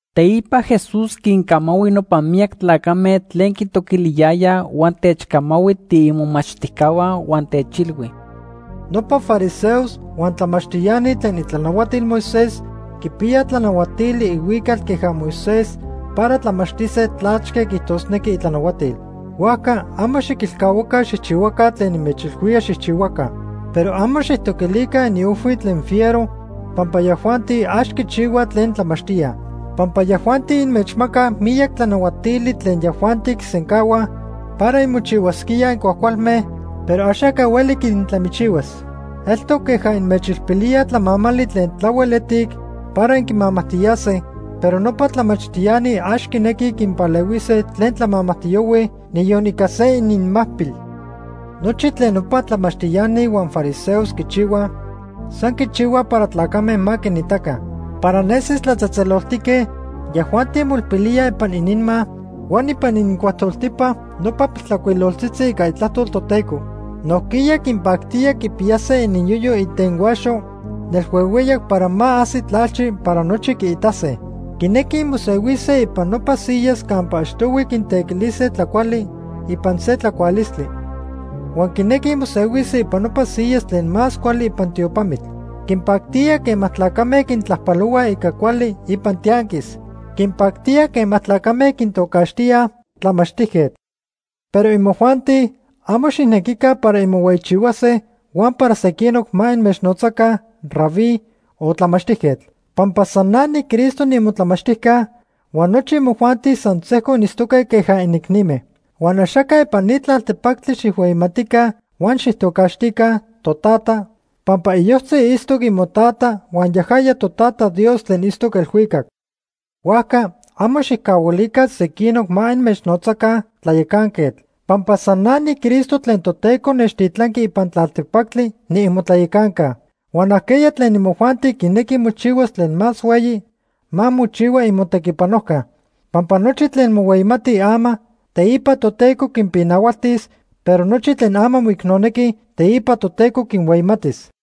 Teipa Jesús quincamahui nopa miyac tlacame tlen quitoquiliyayaj huan techcamahui tiimomachtijcahua huan techilhui: “Nopa fariseos huan tlamachtiani tlen itlanahuatil Moisés quipiyaj tlanahuatili ihuical queja Moisés para tlamachtise tlachque quiijtosnequij itlanahuatil. Huajca amo xiquilcahuaca xijchihuaca tlen inmechilhuíaj xijchihuaca. Pero amo xijtoquilica iniojhui tlen fiero pampa yajuanti ax quichihuaj tlen tlamachtíaj. Pampa yajuanti inmechmacaj miyac tlanahuatili tlen yajuanti quisencahuaj para inmochihuasquíaj incuajcualme, pero axaca hueli quintlamichihuas. Eltoc queja inmechilpilíaj tlamamali tlen tlahuel etic para inquimamajtiyase, pero nopa tlamachtiani ax quinequij quinpalehuise tlen tlamamajtiyohuij niyon ica se ininmacpil. Nochi tlen nopa tlamachtiani huan fariseos quichihuaj, san quichihuaj para tlacame ma quinitaca. Para nesis tlatzejtzeloltique yajuanti moilpilíaj ipan ininma huan ipan inincuajtoltipa nopa piltlajcuiloltzitzi ica Itlajtol Toteco. Nojquiya quinpactía quipiyase ininyoyo itenhuaxo nelhuehueyac para ma ajsi tlalchi para nochi quiitase. Quinequij mosehuise ipan nopa siyas campa achtohui quintequilise tlacuali ipan se tlacualistli. Huan quinequij mosehuise ipan nopa siyas tlen más cuali ipan tiopamitl. Quinpactía quema tlacame quintlajpalohuaj ica cuali ipan tianquis. Quinpactía quema tlacame quintocaxtíaj ‘Tlamachtijquetl’. “Pero imojuanti amo xijnequica para inmohueyichihuase huan para sequinoc ma inmechnotzaca ‘Rabí’ o ‘Tlamachtijquetl’ pampa san na niCristo niimotlamachtijca, huan nochi imojuanti san sejco initztoque queja inicnime. Huan axaca ipan ni tlaltepactli xijhueyimatica huan xijtocaxtica ‘Totata’ pampa iyojtzi itztoc imoTata huan yajaya Totata Dios tlen itztoc elhuicac. Huajca amo xijcahuilica sequinoc ma inmechnotzaca ‘Tlayacanquetl’ pampa san na niCristo tlen Toteco nechtitlanqui ipan tlaltepactli niimotlayacanca. Huan ajqueya tlen imojuanti quinequi mochihuas tlen más hueyi, ma mochihua imotequipanojca. Pampa nochi tlen mohueyimatij ama, teipa Toteco quinpinahualtis, pero nochi tlen ama moicnonequij, teipa Toteco quinhueyimatis.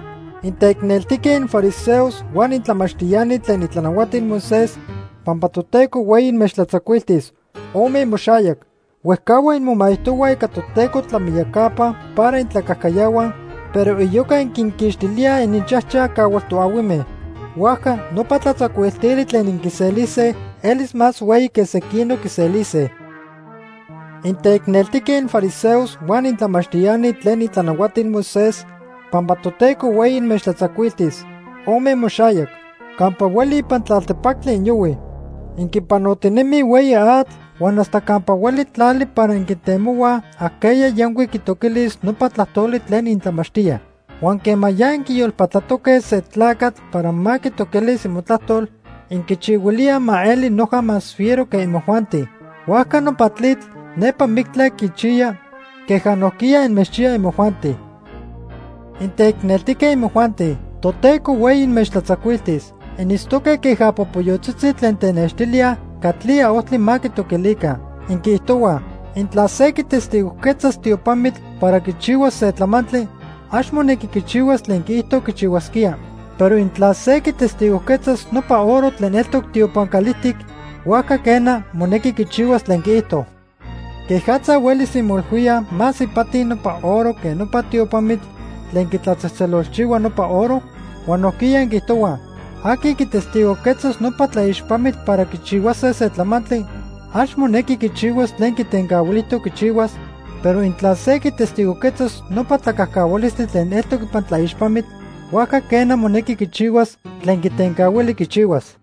“¡Inteicneltijque infariseos huan intlamachtiani tlen itlanahuatil Moisés, pampa Toteco hueyi inmechtlatzacuiltis! Ome imoxayac. Huejcahua inmomaijtohuaj ica Toteco tlamiyacapa para intlacajcayahuaj, pero iyoca inquinquixtilíaj ininchajchaj cahual toahuime. Huajca nopa tlatzacuiltili tlen inquiselise elis más hueyi que sequinoc quiselise. “¡Inteicneltique infariseos huan intlamachtiani tlen itlanahuatil Moisés, pampa Toteco hueyi inmechtlatzacuiltis! Ome imoxayac. Campa hueli ipan tlaltepactli inyohuij. Inquipanotinemij hueyi atl huan hasta campa hueli tlali para inquintemohuaj ajqueya yancuic quitoquilis nopa tlajtoli tlen intlamachtíaj. Huan quema ya inquiyolpatlatoque se tlacatl para ma quitoquilis imotlajtol, inquichihuilíaj ma eli noja más fiero que imojuanti. Huajca nopa tlitl nepa mictla quichiya, queja nojquiya inmechchiya imojuanti. “¡Inteicneltique imojuanti, Toteco hueyi inmechtlatzacuiltis! Initztoque queja popoyotzitzi tlen tenextilíaj catlía ojtli ma quitoquilica. Inquiijtohuaj: ‘Intla se quitestigojquetzas tiopamitl para quichihuas se tlamantli, ax monequi quichihuas tlen quiijto quichihuasquía. Pero intla se quitestigojquetzas nopa oro tlen eltoc tiopan calijtic, huajca, quena, monequi quichihuas tlen quiijto.’ ¿Quejatza huelis inmoilhuíaj más ipati nopa oro que nopa tiopamitl tlen quitlatzejtzelolchihua nopa oro? Huan nojquiya inquiijtohuaj: ‘Aqui quitestigojquetzas nopa tlaixpamitl para quichihuase se tlamantli, ax monequi quichihuas tlen quitencahuilijtoc quichihuas, pero intla se quitestigojquetzas nopa tlacajcahualistli tlen eltoc ipan tlaixpamitl, huajca quena, monequi quichihuas tlen quitencahuili quichihuas.’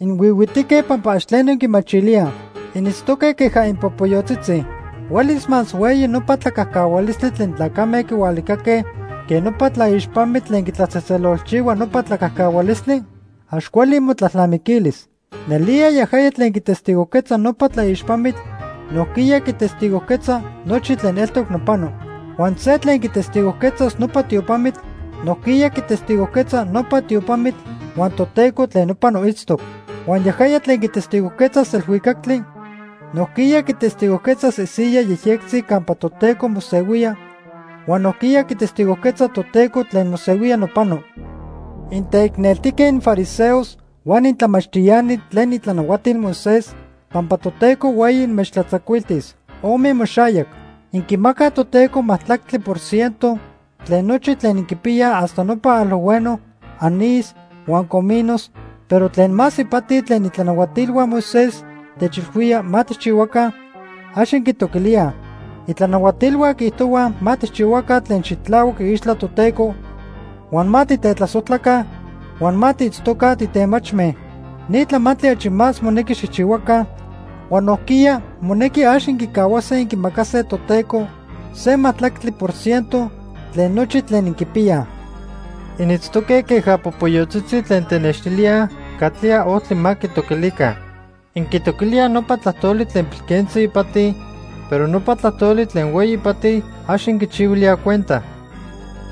¡Inhuihuitique pampa ax tleno inquimachilíaj! Initztoque queja inpopoyotzitzi. ¿Huelis más hueyi nopa tlacajcahualistli tlen tlacame quihualicaque que nopa tlaixpamitl tlen quitlatzejtzelolchihua nopa tlacajcahualistli? ¡Ax cuali imotlalnamiquilis! Nelía yajaya tlen quitestigojquetza nopa tlaixpamitl nojquiya quitestigojquetza nochi tlen eltoc nopano. Huan se tlen quitestigojquetzas nopa tiopamitl, nojquiya quitestigojquetza nopa tiopamitl huan Toteco tlen nopano itztoc. Huan yajaya tlen quitestigojquetzas elhuicactli, nojquiya quitestigojquetzas isiyaj yejyectzi campa Toteco mosehuía huan nojquiya quitestigojquetza Toteco tlen mosehuía nopano. “¡Inteicneltijque infariseos huan intlamachtiani tlen itlanahuatilhua Moisés, pampa Toteco hueyi inmechtlatzacuiltis! ¡Ome imoxayac! Inquimacaj Toteco majtlactli por ciento tlen nochi tlen inquipiyaj hasta nopa alojhueno, anís huan cominos, pero tlen más ipati tlen itlanahuatilhua Moisés techilhuíaj ma tijchihuaca, ax inquitoquilíaj. Itlanahuatilhua quiijtohuaj ma tijchihuaca tlen xitlahuac iixtla Toteco, huan ma titetlasojtlaca huan ma tiitztoca titemachme. Ni tlamantli achi más monequi xijchihuaca, huan nojquiya monequi ax inquicahuase inquimacase Toteco se majtlactli por ciento tlen nochi tlen inquipiyaj. Initztoque queja popoyotzitzi tlen tenextilíaj catlía ojtli ma quitoquilica. Inquitoquilíaj nopa tlajtoli tlen pilquentzi ipati, pero nopa tlajtoli tlen hueyi ipati, ax inquichihuilíaj cuenta.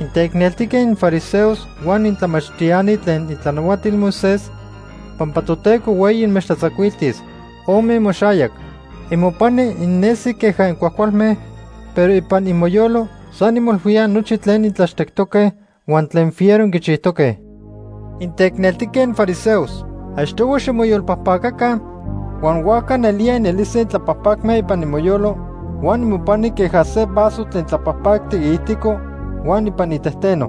“¡Inteicneltique infariseos huan intlamachtiani tlen itlanahuatil Moisés, pampa Toteco hueyi inmechtlatzacuiltis! Ome imoxayac. Imopani innesij queja incuajcualme, pero ipan imoyolo san inmoilhuíaj nochi tlen intlachtectoque huan tlen fiero inquichijtoque. ¡Inteicneltijque infariseos! Achtohui ximoyolpajpacaca, huan huajca nelía inelise intlapajpacme ipan imoyolo huan imopani queja se vaso tlen tlapajpactic iijtico huan ipan itejteno.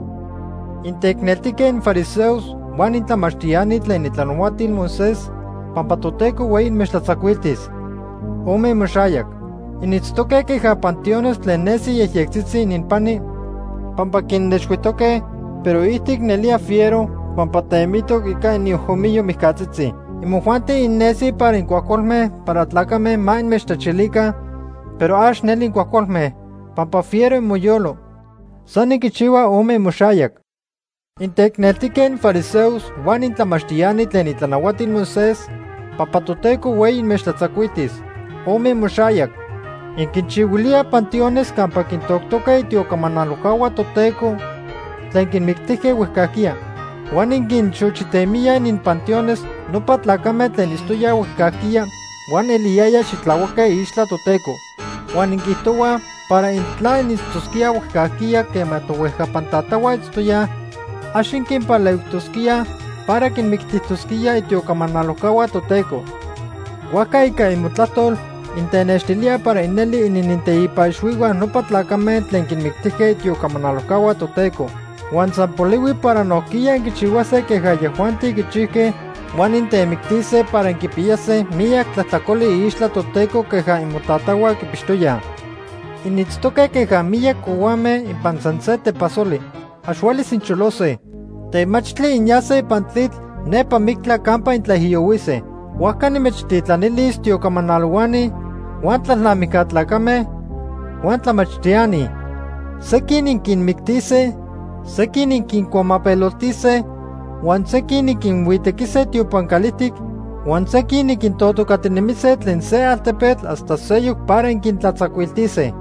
“¡Inteicneltijque infariseos huan intlamachtiani tlen itlanahuatil Moisés, pampa Toteco hueyi inmechtlatzacuiltis! ¡Ome imoxayac! Initztoque queja panteones tlen nesij yejyectzitzi ininpani pampa quinnexhuijtoque, pero iijtic nelía fiero pampa temitoc ica iniojomiyo mijcatzitzi. Imojuanti innesij para incuajcualme para tlacame ma inmechtlachilica, pero ax neli incuajcualme, pampa fiero inmoyolo. San inquichihuaj ome imoxayac. “Inteicneltique infariseos huan intlamachtiani tlen itlanahuatil Moisés, pampa Toteco hueyi inmechtlatzacuiltis. ¡Ome imoxayac! Inquinchihuilíaj panteones campa quintoctoque itiocamanalojcahua Toteco tlen quinmictijque huejcajquiya. Huan inquinxochitemíaj ininpanteones nopa tlacame tlen itztoyaj huejcajquiya huan eliyayaj xitlahuaque iixtla Toteco. Huan inquiijtohuaj para intla initztosquíaj huejcajquiya quema tohuejcapan tatahua itztoyaj, ax inquinpalehuijtosquíaj para quinmictijtosquíaj itiocamanalojcahua Toteco. Huajca ica imotlajtol intenextilíaj para inelij inininteipa ixhuihua nopa tlacame tlen quinmictijque itiocamanalojcahua Toteco. Huan san polihui para nojquiya inquichihuase queja yajuanti quichijque huan intemictise para inquipiyase miyac tlajtlacoli iixtla Toteco queja imotatahua quipixtoyaj. “Initztoque queja miyac cohuame ipan san se tepasoli. Ax huelis incholose. Temachtli inyase ipan tlitl nepa mictla campa intlaijiyohuise. Huajca nimechtitlanilis tiocamanalohuani, huan tlalnamijca tlacame, huan tlamachtiani. Sequin inquinmictise, sequin inquincuamapeloltise huan sequin inquinhuitequise tiopan calijtic, huan sequin inquintotocatinemise tlen se altepetl hasta seyoc para inquintlatzacuiltise.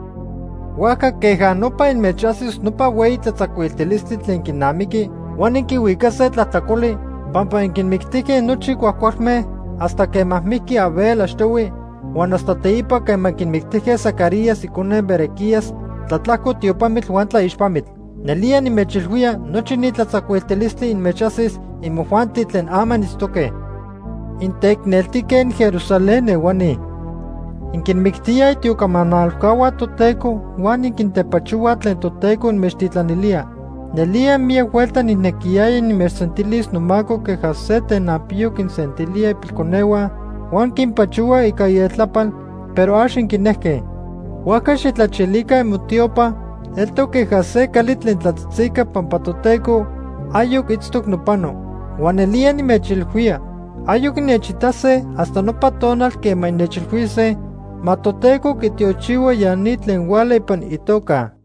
Huajca queja nopa inmechajsis nopa hueyi tlatzacuiltilistli tlen quinamiqui, huan inquihuicase tlajtlacoli pampa inquinmictijque nochi cuajcualme hasta quema mijqui Abel achtohui huan hasta teipa quema inquimictijque Zacarías icone Berequías tlatlajco tiopamitl huan tlaixpamitl. Nelía nimechilhuía nochi ni tlatzacuiltilistli inmechajsis imojuanti tlen ama initztoque. “¡Inteicneltijque inJerusalén ehuani! Inquinmictíaj itiocamanalojcahua Toteco huan inquintepachohuaj tlen Toteco inmechtitlanilía. Nelía miyac huelta nijnequiyaya nimechsentilis nomaco queja se tenanpiyo quinsentilía ipilconehua huan quinpachohua ica ieltlapal, pero ax inquinejque. Huajca xijtlachilica imotiopa eltoc queja se cali tlen tlatzitzica pampa Toteco ayoc itztoc nopano. Huan nelía nimechilhuía ayoc innechitase hasta nopa tonal quema innechilhuise: ‘Ma Toteco quitiochihua ya ni tlen huala ipan itoca.’”